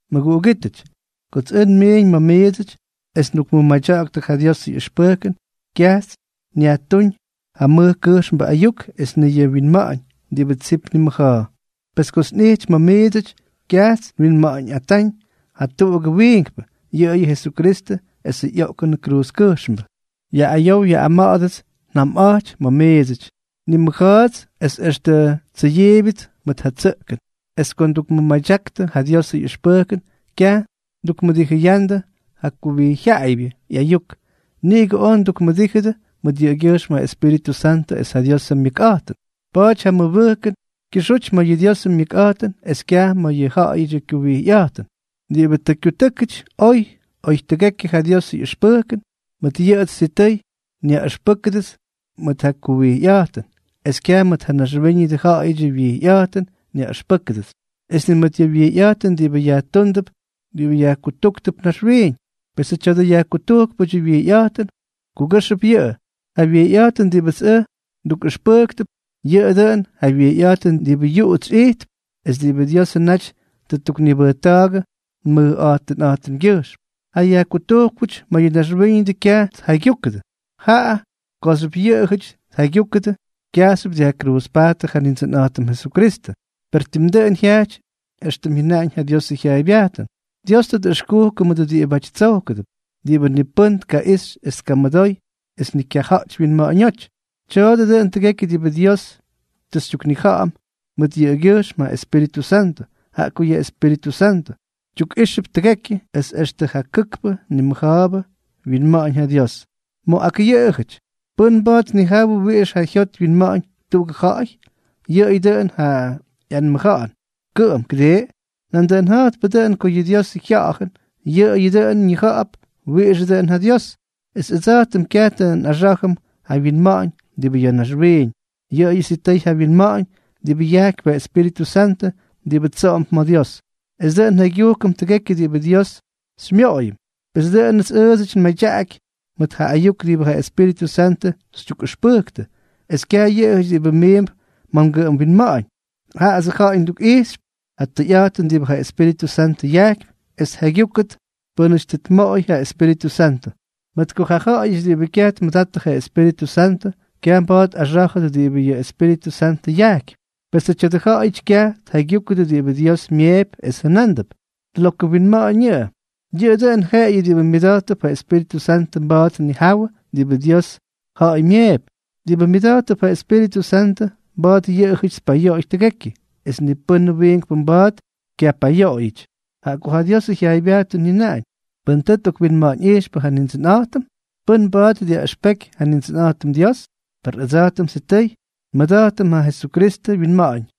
Mʉguꞌugítʉty, kots ʉj nmiiñ ma̱ miidsʉty es ndukmʉmadyaktʉ ja Diosʉ ꞌyʉxpʉjkʉn, kyajts nyajtuuñ ja mʉj kʉjxmbʉ ayuk es ni yʉ wyinma̱ꞌa̱ñ diꞌibʉ tsip nimʉja̱a̱. Pes kots nꞌijty ma̱ miidsʉty, kyajts nwinma̱ꞌa̱ñꞌatáñ jatuꞌugʉ wiinkpʉ, yʉꞌʉyʉ Jesukristʉ esʉ ꞌyoꞌkʉn kruuzkʉjxmbʉ. Yaꞌꞌayow yaꞌꞌama̱ꞌa̱dʉts njamꞌa̱jty ma̱ miidsʉty, ni nmʉja̱a̱ts es extʉ tsʉyiibyʉts mʉt ja tsʉꞌkʉn, es ko ndukmʉmadyaktʉ ja Diosʉ ꞌyʉxpʉjkʉn, kyaj ndukmʉdijʉyandʉ ja kuwijyjyaꞌaybyʉ ꞌyayuk, niꞌigʉ oj ndukmʉdíjʉdʉ mʉt yʉꞌʉgyʉjxm ja Espíritʉ Santʉ es ja Diosʉ myʉkꞌa̱jtʉn. Pa̱a̱ty ja mmʉbʉjkʉn kyʉxuty ma̱ yʉ Diosʉ myʉkꞌa̱jtʉn es kyaj ma̱ yʉ ja̱ꞌa̱yʉdyʉ kyuwijyꞌa̱jtʉn. Diꞌibʉ tʉ kyutʉ́kʉty oy oy tʉgekyʉ ja Diosʉ ꞌyʉxpʉjkʉn, mʉt yʉꞌʉts sitʉy nyaꞌʉxpʉ́kʉdʉts mʉt ja kuwijyꞌa̱jtʉn, es kyaj mʉt ja naxwíñʉdʉ ja̱ꞌa̱yʉdyʉ wyijyꞌa̱jtʉn nyaꞌʉxpʉ́kʉdʉts, es ni mʉt ja wyijyꞌa̱jtʉn diꞌibʉ yajtuundʉp diꞌibʉ yajkutujktʉp naxwiiñ. Pesʉ tya̱dʉ yajkutujkpʉdyʉ wyijyꞌa̱jtʉn, kugʉ́xʉp yʉꞌʉ. Ja wijyꞌa̱jtʉn diꞌibʉts ʉj tukꞌʉxpʉjkp, yʉꞌʉ dʉꞌʉn ja wijyꞌa̱jtʉn diꞌibʉ yuꞌuts ijtp es diꞌibʉ Diosʉ naty tʉ ttuknibʉjta̱a̱gʉ nmʉjꞌa̱jtʉnꞌa̱jtʉmgyʉjxm. Ja yajkutujkpʉty ma̱ yʉ naxwíñʉdʉ kyaj tjaygyujkʉdʉ; jaꞌa kooxyʉp yʉꞌʉjʉty tjaygyujkʉdʉ, kyajxyʉp dyajkruuzpajttʉ ja Nindsʉnꞌa̱jtʉm Jesukristʉ. Per tim dʉꞌʉn jyajty éxtʉm jyʉnaꞌañ ja Diosʉ jyaaybyajtʉn: Dios tʉ tꞌʉxkukʉ mʉdʉ diꞌibáty tsojkʉdʉp, diꞌibʉ ni pʉ́nʉm tkaꞌixy es tkamʉdoy es ni kyaja̱ꞌty wyinma̱ꞌa̱ñóty. Tya̱a̱dʉ dʉꞌʉn tʉgekyʉ diꞌibʉ Dios tʉ xytyuknija̱ꞌa̱m mʉt yʉꞌʉgyʉjxm ja Espíritʉ Santʉ, jaꞌa ko yʉ Espíritʉ Santʉ tyukꞌijxʉp tʉgekyʉ, es extʉ ja kʉkpʉ nimʉja̱a̱bʉ wyinma̱ꞌa̱ñ ja Dios. Ma̱ ak ja̱ꞌa̱yʉty, ¿pʉ́n mba̱a̱t tnijawʉ wiꞌix ja jyot wyinma̱ꞌa̱ñ tuꞌugʉ ja̱ꞌa̱y? Yʉꞌʉyʉ dʉꞌʉn ja ꞌyanmʉja̱ꞌa̱n kʉꞌʉm, ¿kʉdii? Nandʉꞌʉn ja̱jtpʉ dʉꞌʉn ko yʉ Diosʉ Jya̱ꞌa̱jʉn, yʉꞌʉyʉ dʉꞌʉn ñija̱ꞌa̱p wiꞌixʉ dʉꞌʉn ja Dios. Es ʉdsa̱jtʉm kyaj tʉ nꞌaxá̱jʉm ja winma̱ꞌa̱ñ diꞌibʉ ya̱ naxwiiñ, yʉꞌʉyʉ sitʉy ja winma̱ꞌa̱ñ diꞌibʉ yajkypy ja Espíritʉ Santʉ diꞌibʉ tsoꞌomp ma̱ Dios, es dʉꞌʉn njaygyujkʉm tʉgekyʉ diꞌibʉ Dios xyñamoꞌoyʉm. Pes dʉꞌʉnʉts ʉʉdsʉty nmadyaꞌaky mʉt ja ayuk diꞌibʉ ja Espíritʉ Santʉ xytyukꞌʉxpʉjktʉ, es kyaj yʉꞌʉjʉty diꞌibʉ miimp ma̱ ngʉꞌʉm winma̱ꞌa̱ñ; jaꞌats ja̱ꞌa̱y ndukꞌijxp ja tʉyꞌa̱jtʉn diꞌibʉ ja Espíritʉ Santʉ yajkypy es tjaygyúkʉdʉ pʉ́nʉty tuꞌumooyʉdʉp ja Espíritʉ Santʉ. Mʉt ko ja ja̱ꞌa̱yʉty diꞌibʉ kyaj tmʉdattʉ ja Espíritʉ Santʉ, kyaj mba̱a̱t tꞌaxá̱jʉdʉ diꞌibʉ ja Espíritʉ Santʉ yajkypy. Pesʉ tya̱dʉ ja̱ꞌa̱yʉty kyaj tjaygyúkʉdʉ diꞌibʉ Dios myeepy es jʉnándʉp: “Lokʉ winma̱ꞌa̱ñ yʉꞌʉ.” Yʉꞌʉyʉ dʉn jeꞌeyʉ diꞌibʉ myʉda̱jttʉp ja Espíritʉ Santʉ mba̱a̱t tnijawʉ diꞌibʉ Diosʉ ja̱ꞌa̱y myeepy. Diꞌibʉ myʉda̱jttʉp ja Espíritʉ Santʉ, mba̱a̱t yʉꞌʉjʉty tpayoꞌoy tʉgekyʉ, es ni pʉ́n wiinkpʉ mba̱a̱t kyaj pyayoꞌoyʉty. Jaꞌa ko ja Diosʉ jyaaybyajtʉn jyʉnaꞌañ: “¿Pʉ́n tʉ tꞌokwinma̱ꞌa̱ñꞌijxpʉ ja Nindsʉnꞌa̱jtʉm? ¿Pʉ́n mba̱a̱t dyaꞌʉxpeky ja Nindsʉnꞌa̱jtʉm Dios?” Per ʉdsa̱jtʉm sitʉy nmʉda̱jtʉm ja Jesukristʉ wyinma̱ꞌa̱ñ.